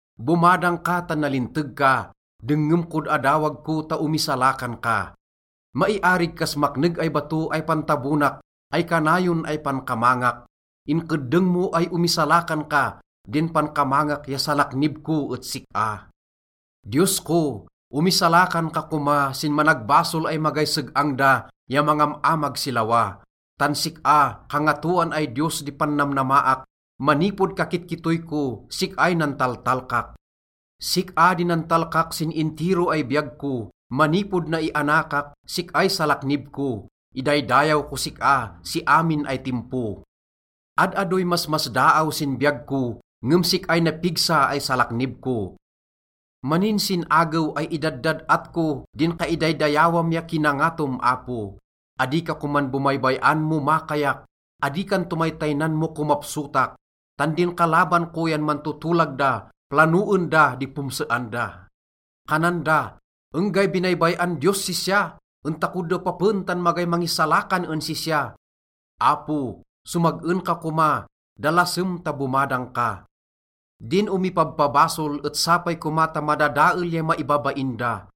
Bomadang ka tan nalinteg ka, dengngem kod adawag ko ta omisalakan ka. Maiarig kas makneg ay bato ay pantabonak ay kanayon ay pankamangak. Inkeddeng mo ay omisalakan ka, din pankamangak ya salaknib ko et sik-a. Diyos ko, omisalakan ka koma sin managbasol ay magay seg-ang da ya mangam-amag si lawa. Tan sik-a, Kangatoan ay Diyos, di pannamnamaak, manipod kakitkittoy ko, sik-ay nantaltalkak. Sik-a di nantalkak sin intiro ay biyag ko, manipod naianakak sik-ay salaknib ko, idaydayaw kos sik-a si amin ay timpo. Ad-adoy masmasdaaw sin biyag ko, ngem sik-ay napigsa ay salaknib ko. Maninsin-agew ay idaddad-at ko din kaidaydayawam ya kinangatom, Apo. Adi ka koman bomaybay-an mo makayak, adi kan tomaytaynan mo komapsotak. Tan din kalaban ko yan mantotolag da, planoen da di pomsean da. Kanan da, “Enggay binaybay-an Diyos sisya. En tako depapen tan magay mangisalakan en sisya.” Apo, somag-en ka koma, dalasem ta bomadang ka. Din omipabpabasol et sapay koma ta madadael ya maibabain da.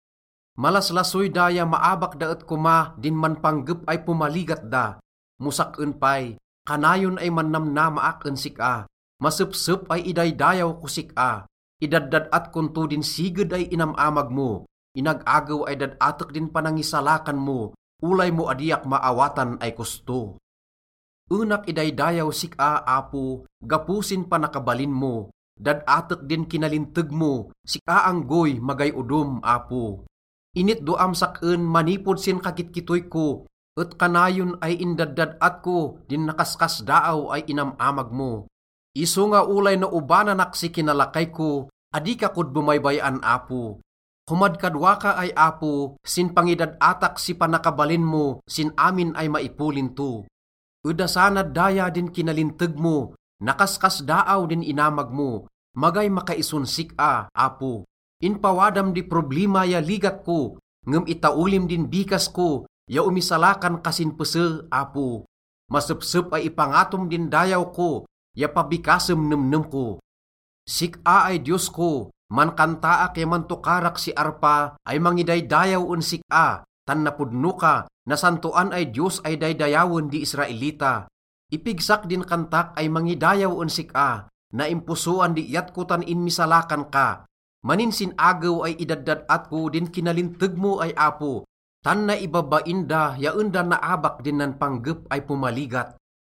Malaslasoy da ya maabak da et koma din manpanggep ay pomaligat da. Mo sak-en pay, kanayon ay mannamnamaak en sik-a, masepsep ay idaydayaw kos sik-a. Idaddad-at kon to din siged ay inam-amag mo. Inag-agew ay dad-atek din panangisalakan mo, olay mo adiak maawatan ay kosto. Enak idaydayaw sik-a, Apo, gapo sin panakabalin mo. Dad-atek din kinalinteg mo, sik-a anggoy, magay odom, Apo. Initdoam sak-en manipod sin kakitkittoy ko, et kanayon ay indaddad-at ko din nakaskasdaaw ay inam-amag mo. Isonga olay naobananak si kinalakay ko, adi ka kod bomaybay-an, Apo. Komadkadwa ka ay Apo sin pangidad-atak si panakabalin mo sin amin ay maipolin to. Edasanad daya din kinalinteg mo, nakaskasdaaw din inamag mo, magay makaison sik-a, Apo. Inpawadam di problima ya ligat ko, ngem itaolim din bikas ko ya omisalakan ka sin pese, Apo. Masepsep ay ipangatom din dayaw ko ya pabikasem nemnem ko. Sik-a ay Diyos ko, mankantaak ya mantokarak si arpa ay mangidaydayaw en sik-a, tan napodno ka, nasantoan ay Diyos ay daydayawen di Israelita. Ipigsak din kantak ay mangidayaw en sik-a, naimposoan di iyat ko tan inmisalakan ka. Maninsin-agew ay idaddad-at ko din kinalinteg mo ay Apo, tan naibabain da ya en da naabak din nanpanggep ay pomaligat.